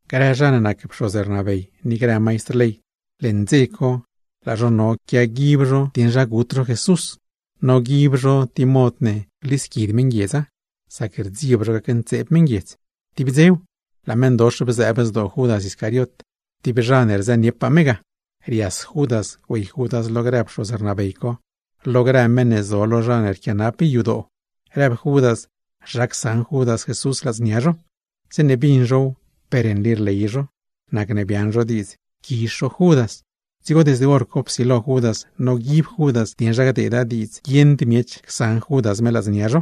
Grë zha ne nac pxoz rnabey ni grë maistr ley, leṉ dze co laa zho no quiaguib zho dieṉ zha gut zho Jesús. Noguib zho tib mod ne glisquid meṉguiedza; sac rdzieb zho gacntseeb meṉguiedz. Tib dzew, laa meṉdox bzëëb zdoo Judas Iscariot, tib zha ne rzëniepaa me ga, rias Judas güey Judas lo grë pxoz rnabey co, lo grë meṉ ne zo lo zha ne rquianap yadoo, rëb Judas zha csaṉ Judas Jesús ladznia zho. Zeeṉe bin zhow per nli rley zho, nacne biaaṉ zho diidz quizh zho Judas. Dzigo desde hor co psilo Judas noguib Judas dieṉ zha gdeeda diidz guieṉd miech csaṉ Judas me ladznia zho.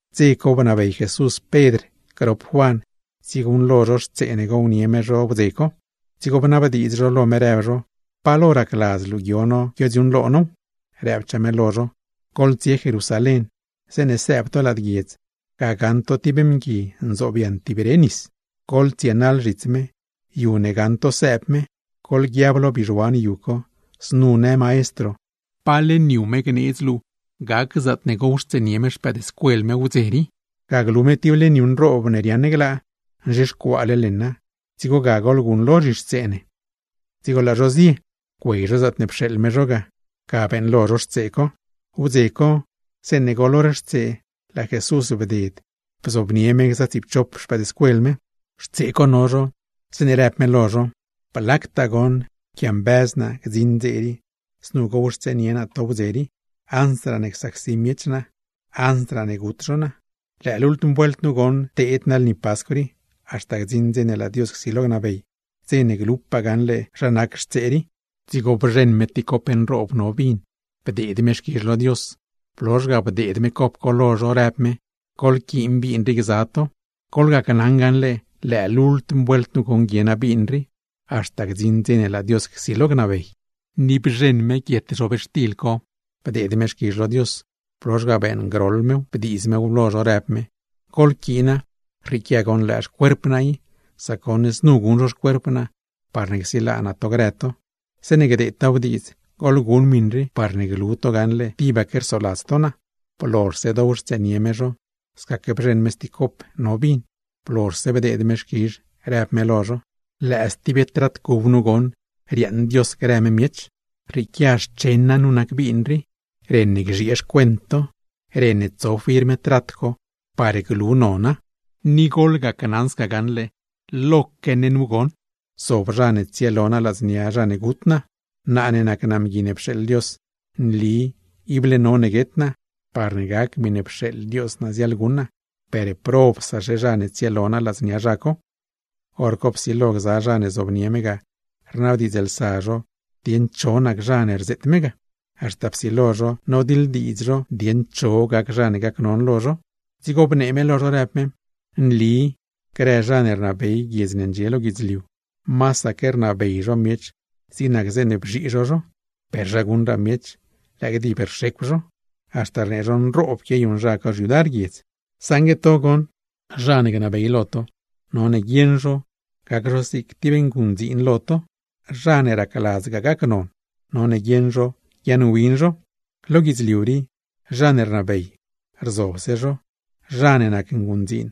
Dze co bnabey Jesús Pedr grop Juan tsieguṉlo zho xtsee ne gownie me zho wdze co. Dzigo bnabdiidz zho lo me, rëb zho: ―¿Pa lo racladz luu guio no guiodziuuṉlo now? Rëbchaa me lo zho: ―Goḻtsie Jerusalén. Zeeṉe sëëb to lad guiedz, ga gaṉ to tib mgui nzobyaṉ tib re nis, goḻtsienaḻ zhits me. Yu ne gaṉ to sëëb me, goḻguiab lo bizhuan yu co: “Znu në Maestro, ¿pa leṉ yu me gneedz luu gac zaatne gowxtseenie me xpëëdscuel me wdze rii?” Ga glu me tib leṉ yu nroob ne riaaṉ glaa, nzhixcuaale leṉa, dzigo ga goḻguṉlo zhixtsee ne. Dzigo laa zho zie. Güey zho zaatne pxeeḻ me zho ga, ga beeṉlo zho xtsee co. Wdze co, zeeṉe goḻ hor xtsee laa Jesús bded lo mezh gza me gza tsiipchop xpëëdscuel me. Xtsee co no zho, zeeṉe rëb me lo zho: ―¡Blactaa goṉ pquiambëz naa gdziṉ dze rii, znu gowxtseenie naa to nawdze rii, ansraa csacsi miech naa, gut zho naa! Lëë lultm vuelt nu goṉ teed naa lni Pascw rii, haxta gdziṉ dze ne laa Dios csilo gnabey, dze ne glupaa gaṉle zha nac xtsee rii. Dzigo bzheṉ me tib cop nroob no vin, bdeed me xquizh lo Dios, blozh ga bdeed me cop co lo zho, rëb me: ―Goḻquiin vin rii gza to. Gneli naa lo to gaṉle, lëë lultm vuelt nu guie naa vin rii, haxta gdziṉ dze ne laa Dios csilo gnabey. Ni bzheṉ me guietxtil, bdeed me xquizh lo Dios, blozh ga beeṉgroḻ mew bdiiz mew lo zho, rëb me: ―Goḻquiina, rrieequia goṉ lëë xcuerp naa i, sac goṉ znu guṉ zho xcuerp naa parne csilaa naa to grë to. Zeeṉe gdeedtaaw diidz, goḻguṉ miṉ rii parne glu to gaṉle tibaque rsoladz to naa. Blozhse dowxtseenie me zho, scaque bzheṉ me stib cop no vin, blozhse bdeed me xquizh, rëb me lo zho: ―Lëë stib trat cub nu goṉ riaaṉ Dios grë me miech, rrieequia xchen naa nu nac vin rii, ren ne gzhiee xcuent to, ren ne tso firm trat co par glu nona. Ni gacnaṉ to gaṉle, lo mezhaque nu goṉ zob zha ne tsielo naa ladznia zha ne gut naa. Naa ne nac naa Mgui ne pxeeḻ Dios, nli, ible none guet naa, parne gac miṉe pxeeḻ Dios naa ziaḻguṉ naa, ¡per probsaxe zha ne tsielo naa ladznia zha co! Horco psilo gza zha ne zobnie me ga, rnabdiidzlsa zho dieṉ cho nac zha ne rzeet me ga; haxta psilo zho nodiḻdiidz zho dieṉ cho gac zha ne gacnon lo zho. Dzigo bnee me lo zho, rëb me: ―Nli grë zha ne rnabey guiedz ne ndxie lo guidzliu, masaque rnabey zho miech zig nac zeeṉe bzhii zho zho, per zha guṉraa miech, lëë gdib rxecw zho, haxta rnee zho nroob quiayuṉ zha co xyudar guiedz. Saṉgue to goṉ, zha ne gnabey lo to, none guieṉ zho gac zho zig tib nguṉdziin lo to; zha ne racladzgaa gacnon, none guieṉ zho guiaaṉwin zho. Lo guidzliu rii, zha ne rnabey, rzobse zho, zha ne nac nguṉdziin,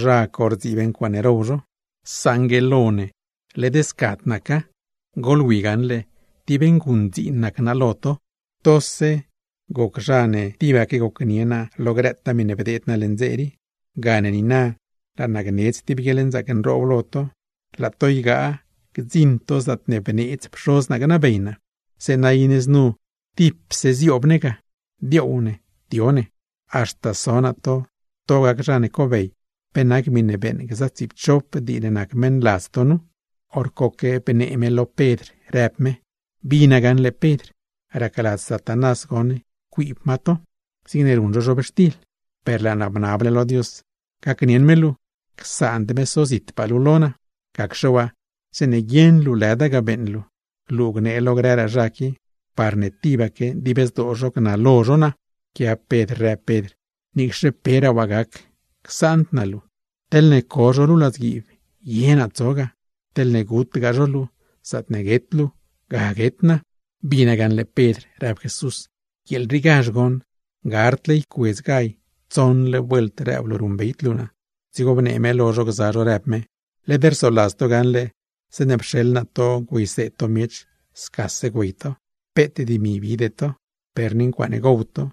zha co rdziib ncuaaṉe row zho. ¡Saṉgue lo ne, led scad naca! ¡Goḻwi gaṉle, tib nguṉdziin nac naa lo to! ’Tose goc zha ne tibaque gocnie naa lo grëtaa miṉe bdeed naa leṉ dze rii. Gane niina, laa naa gneedz tib guieḻnzaac nroob lo to ygaa to gdziṉ to zaatne bneedz Pxoz naa gnabey naa; zeeṉa iṉe znu tipse zioob ne lo xmezh naa ga, dioow ne, dio ne. Haxta so naa to, to gac zha ne cobey, pe nac miṉe beeṉ gza tsiipchop dii ne nac meṉladz to nu. Horcoque bnee me lo Pedr rëb me: ―Bina gaṉle Pedr, racladz Satanás goṉ ycuiib ma to, zigne ruṉ zho zhobxtil. Per laa naa bnable lo Dios, gacnieṉ me luu, csaand me sozitpaa luu lo naa. Gacxe waa, zeeṉe guieṉ luu lëda ga beeṉ luu, luu gnee lo grëraa zha qui, parne tibaque dib zdoo zho gnalo zho naa. Pquiab Pedr rëb Pedr: ―Niicxe peraa waa gac, csaand naa luu. Teḻne co zho luu ladzguiib, ye naa tso ga, ¡teḻne gutgaa zho luu, zaatne guet luu, ga guet naa! ―Bina gaṉle Pedr ―rëb Jesús―. ¡Guieel riigazh goṉ, gardle ycuedz gall, tsoṉle vuelt rëb luu ruṉbeyd luu naa! Dzigo bnee me lo zho gza zho, rëb me: ―Led rsoladz to gaṉle zeeṉe pxeḻ naa to güeyseed to miech, scase güey to, peet dimi bide to, per ni ncuaaṉe gow to,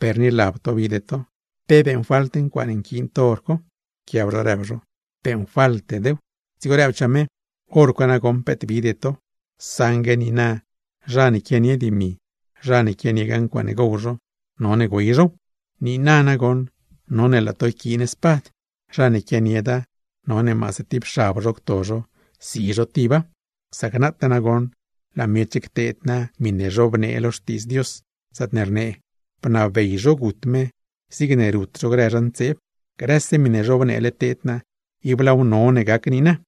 per ni lab to bide to. ¿Pe beeṉfalt ncuaaṉe nquiin to hor co? Pquiab zho rëb zho: ―Beeṉfaltedew. Dzigo rëbchaa me: ―Horco nagoṉ peet bide to, saṉgue niina zha ne quianie dimi, zha ne quianiegaa ncuaaṉe gow zho, none güey zhow. Niina nagoṉ none laa to yquiin spad. Zha ne quianieda, none maase tib xab zho cto zho, si zho tiba. Sac nataa nagoṉ, laa miech cteed naa miṉe zhobnee lo Xtiidz Dios, zaatne rnee: “Bnabey zho gut me, zigne rut zho grë zha ntseeb.” Grëse miṉe zhobneele teed naa, ib laaw none gac niina.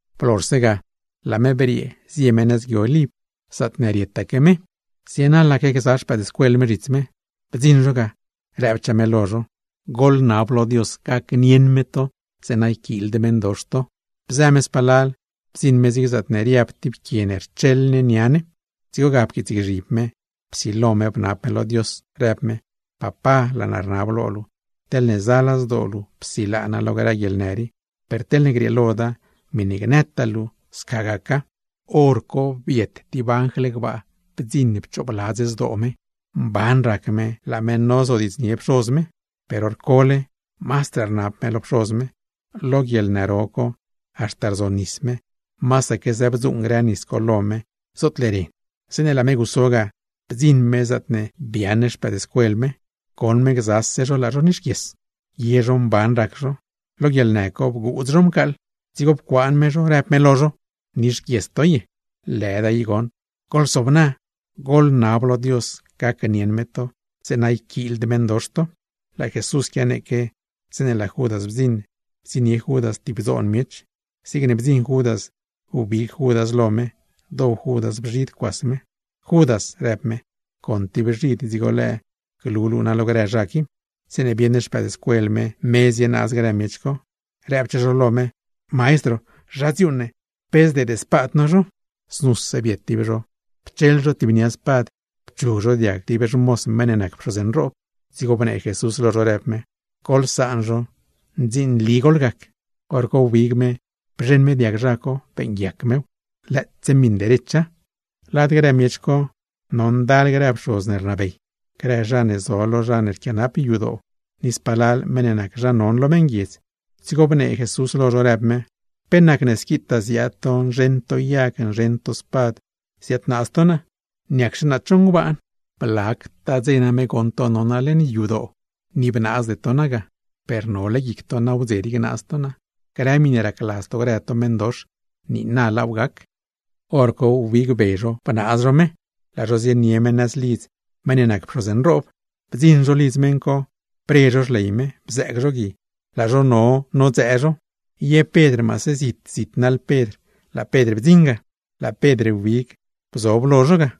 Blozhse ga, laa me briee zie me nëz Gui Oliv, zaatne rietaque me; zienaḻaque gza xpëëdscuel me zhits me. Bdziṉ zho ga, rëbchaa me lo zho: ―Goḻnab lo Dios gacnieṉ me to, zeeṉa yquiild meṉdox to. Bzë me spalal, bdziṉ me zig zaatne riab tib quie ne rcheḻ ne nia ne, dzigo ga pquiitsgzhib me, psilo me bnab me lo Dios, rëb me: ―Papá, laa naa rnab lo luu, teḻne zala zdoo luu, psilaa naa lo grë guieḻnë rii. Per teḻne grieeloda, miṉe gnëtaa luu sca gaca. Horco biet tib anjl gbaa bdziṉ pchoobladz zdoo me. Mban rac me laa me nozodiidznie Pxoz me, per hor cole mazdraa rnab me lo Pxoz me; lo guieḻnë ro co haxta rzonis me, masaque zëbdzuuṉ grë nis co lo me zootle ren. Zeeṉe laa me guso ga, bdziṉ me zaatne biaaṉ xpëëdscuel me, goṉ me gzase zho laa zho nixguies. Ye zho mban rac zho, lo guieḻnë co bguudz zho mcaaḻ. Dzigo pcuaan me zho, rëb me lo zho: ―¿Nixguies to ye? Lëda i goṉ, ¡goḻsobna! Goḻnab lo Dios, gacnieṉ me to, zeeṉa yquiild meṉdox to. Laa Jesús quianeeque, zeeṉe laa Judas bdziṉ bdziṉnie Judas tib dzoon miech. Zigne bdziṉ Judas, wbig Judas lo me, dow Judas bzhid cuas me. ―¡Judas! ―rëb me―. ¿Con tib bzhid dzigo lëë glu luu naa lo grë zha qui? Zeeṉe bieṉ xpëëdscuel me, me zienaaz grë miech co, rëbchaa zho lo me: ―Maestro, ¿zha dziuuṉ ne? ¿Pe zdeed spad no zho? Znuse biet tib zho pcheḻ zho tib nia spad, pchug zho diag tib xmoz meṉ ne nac pxoz nroob. Dzigo bnee Jesús lo zho rëb me: ―Goḻsaan zho, ndzinli goḻgac. Horco wbig me bzheṉ me diag zha co, beeṉguiac mew, lëëtse miṉ derecha. Lad grë miech co no ndal grë pxoz ne rnabey, grë zha ne zo lo zha ne rquianap yadoo, ni spalal meṉ ne nac zha non lo meṉguiedz; dzigo bnee Jesús lo zho, rëb me: ―¿Pe nacne squitaa ziaad to, nzheṉ to yag, nzheṉ to spad ziadnaaz to naa? ¿Niacxe naa cho ngbaan? Blactaa dze name goṉ to no naa leṉ yadoo, ni bnaazde to naa ga. Per nole guic to nagoṉ nawdze rii gnaaz to naa; grë miṉe racladz to grë to meṉdox, niina laaw gac. Horco wbig be zho bnaaz zho me, laa zho zienie me nëz lidz meṉ nac pxoz nroob. Bdziṉ zho lidz meṉ co, bre zho xley me, bzëëg zho gui, laa zho no nodzëë zho. Ye Pedr maase zit zit naḻ Pedr, laa Pedr bdziṉ ga; laa Pedr wbig bzob lo zho ga.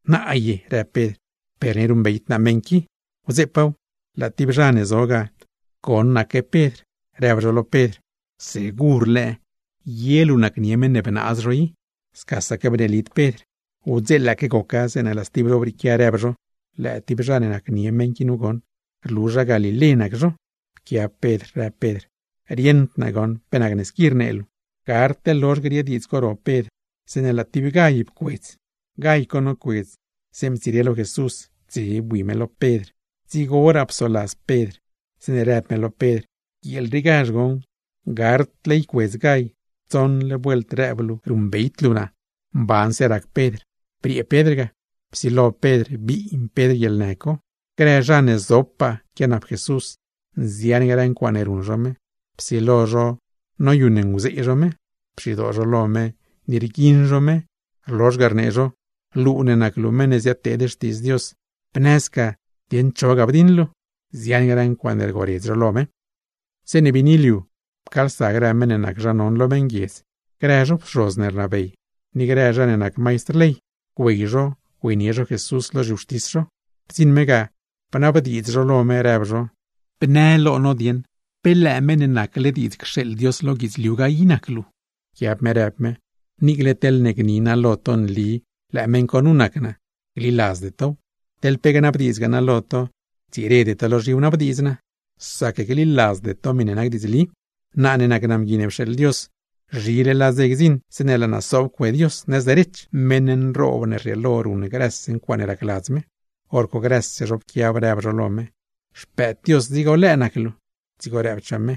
―¿Naa ye? ―rëb Pedr―, ¡per ni ruṉbeyd naa meṉ qui! Wdzeepaaw, laa tib zha ne zo ga, goṉaque Pedr, rëb zho lo Pedr: ―¿Segur lëë ye luu nacnie meṉ ne bgaa i? Scasaque bneelid Pedr. Wdzeelaaque goca, zeeṉ laa stib zho brieequia, rëb zho: ―Lëë tib zha ne nacnie meṉ qui nu goṉ. ¡Rlu zha galilé nac zho! Pquiab Pedr, rëb Pedr: ―¡Rieṉd naa goṉ, pe nacne squi rnee luu! Gardle lozh griee diidz co ro Pedr, zeeṉe laa tib gall pcuedz. Gall co nocuedz, zeeṉe ptsire lo Jesús, dze bui me lo Pedr; dzigoraa psoladz Pedr zeeṉe rëb me lo Pedr: “¡Guieel riigazh goṉ, gardle ycuedz gall, tsoṉle vuelt rëb luu ruṉbeyd luu naa!” Mbanse rac Pedr. Briee Pedr ga, psilo Pedr biin Pedr guieḻnë co. Grë zha ne zopaa quianap Jesús, nzian grë ncuaaṉe ruṉ zho me, psilo zho noyuṉnguzee zho me. Pxidoo zho lo me, ni rguiṉ zho me, rlozh ga, rnee zho: ―Luu ne nac luu meṉ ne ziadteed xtiidz Dios, ¿bnë sca dieṉ cho ga bdiṉ luu? Nzian grë ncuaaṉe rgoredz zho lo me. Zeeṉe biini liu, pcaalsa grë meṉ ne nac zha non lo meṉguiedz, grë zho pxoz rnabey, ni grë zha ne nac maistr ley, güey zho güeynie zho Jesús lo zhiwxtis zho. Bdziṉ me ga, bnabdiidz zho lo me rëb zho: ―Bnë lo no dieṉ, ¿pe lëë Meṉ ne nacle diidz cxeeḻ Dios lo guidzliu ga i nac luu? Pquiab me rëb me: ―Niicle teḻne gni naa lo to nli lëë meṉ co nu nac naa, gliladzde tow, teḻ pe gnabdiidzgaa naa lo to, ctsirede to low; sac gliladzde to miṉe nac diidzli. Naa ne nac naa Mgui ne pxeeḻ Dios, zhile laa dze gdziṉ zeeṉe laa naa sob cue Dios nëz derech, meṉ nroob ne rrieelo ruṉ grëse ncuaaṉe racladz me. Horco grëse zho pquiab, rëb zho lo me: ―¿Xpëëd Dios dzigo lëë nac luu? Dzigo rëbchaa me: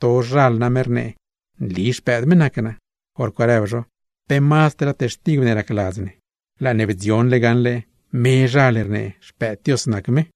―Tozhal name rnee, nli Xpëëd me nac naa. Horco rëb zho: ―¡Pe mazdraa textigw ne racladz ne! ¡Laa ne bdzionle gaṉle mezhal rnee Xpëëd Dios nac me!